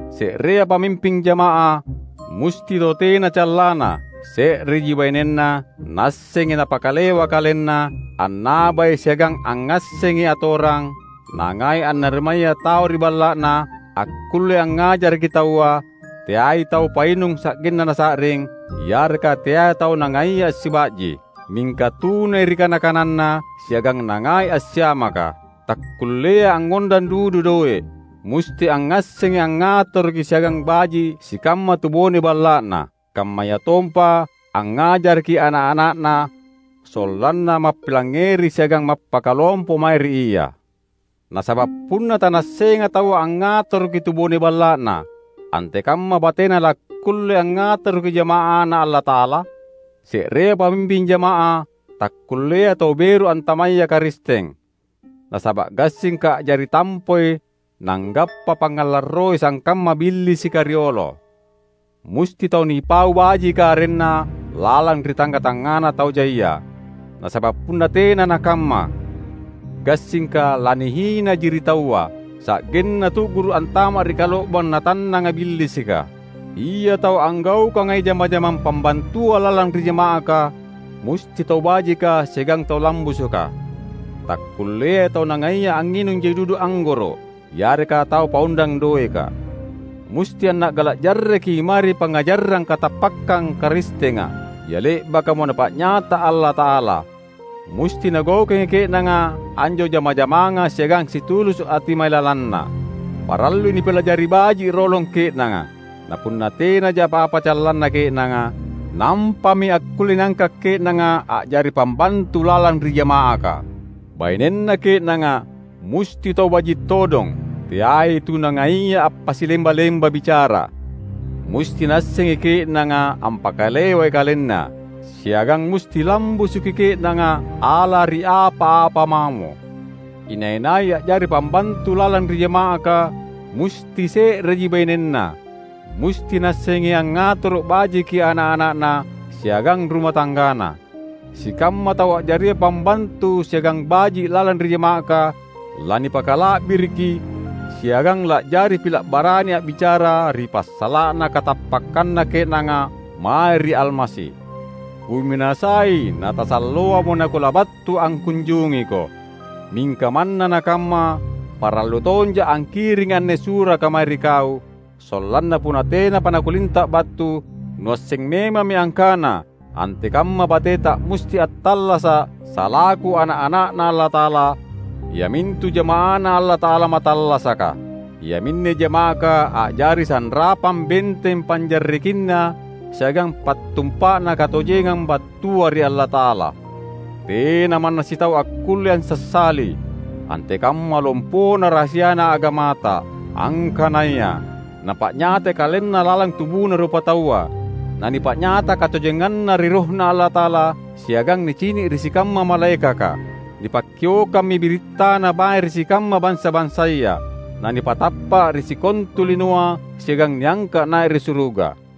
Se’rea pamimping jama’ah, musti tau tena callanna, se’reji bainenna, naassengi napakalewa kalenna, annabai siagang angngassengi atorang; nangai annarimaya tau ri balla’na, akkullei angngajaraki taua; teai tau painung sa’genna nasa’ring, yareka teai tau nangaia assiba’ji. Mingka tunai ri kana-kananna siagang nangai assiamaka. Takkulleai angngondang dudu doe’. Musti angngassengi angngatoroki siagang baji’ sikamma tubone balla’na, kammayatompa angngajaraki ana’-ana’na sollanna mappilangngeri siagang mappakalompo mae ri ia. Nasaba’ punna tanaassenga taua angngatoroki tubone balla’na, antekamma batena lakkulle angngatoroki jama’aNa Allata’ala? Se’rea pamimping jama’ah takkulleai tau beru antamaya Karisteng, nasaba’ gassingka a’jari tampoi nanggappa pangngalarroi sangkamma Billisika riolo. Musti tau nipau bajika arenna lalang ri tangnga-tangngana tau jaia; nasaba’ punna tena nakamma, gassingka lanihinaji ri taua, sa’genna tu’guru’ antama’ ri kalo’bang natannanga Billisika. Ia tau anggaukangai jama-jamang pambantua lalang ri jama’aka, musti tau bajika siagang tau lambusuka; takkulleai tau nangaia anginung jai dudu anggoro’ yareka tau paondang doeka. Musti anna’gala’ jarreki mae ri pangngajarang katappakkang Karistenga, ia le’bakamo Napa’nyata Allata’ala. Musti nagaukangi ke’nanga anjo jama-jamanga siagang situlusu’ ati mailalanna. Parallui nipilajari baji’ rolong ke’nanga; na punna tenaja apa-apa callanna ke’nanga, nampami akkulle niangka’ ke’nanga a’jari pambantu lalang ri jama’aka. Bainenna ke’nanga musti tau baji’ todong, teai tu nangaia appasilemba-lemba bicara. Musti naassengi ke’nanga ampakalewai kalenna, siagang musti lambusuki ke’nanga ala ri apa-apa mamo. Inai-nai a’jari pambantu lalang ri jama’aka musti se’reji bainenna. Musti naassengi angngatoro’ bajiki ana’-ana’na siagang ruma tanggana. Sikamma tau a’jaria pambantu siagang baji’ lalang ri jama’aka lanipakala’biriki siagang la’jari pila’ barani a’bicara ri passala’na katappakkanna ke’nanga mae ri Almasi. Kuminasai natasalloamo nakulabattu angkunjungiko. Mingka manna nakamma parallu tonja’ angkiringi anne suraka mae ri kau, sollanna punna tenapa nakulinta’ battu, nuasseng memammi angkana antekamma bateta musti attallasa’ salaku ana’-ana’Na Allata’ala, iamintu jama’aNa Allata’ala mattallasaka. Iaminne jama’aka a’jari sanrapang benteng panjarrekinna siagang pattumpa’na katojengang battua ri Allata’ala. Tena manna sitau akkulle ansassali, antekamma lompona rahasiana agamata, angkanaya: Napa’nyatai KalenNa lalang tubuna rupataua, na nipa’nyata katojenganNa ri RohNa Allata’ala siagang nicini’ ri sikamma malaekaka. Nipakkiokkammi birittana mae ri sikamma bansa-bansaya, na nipatappa’ ri sikontu linoa siagang niangka’ nai’ ri suruga.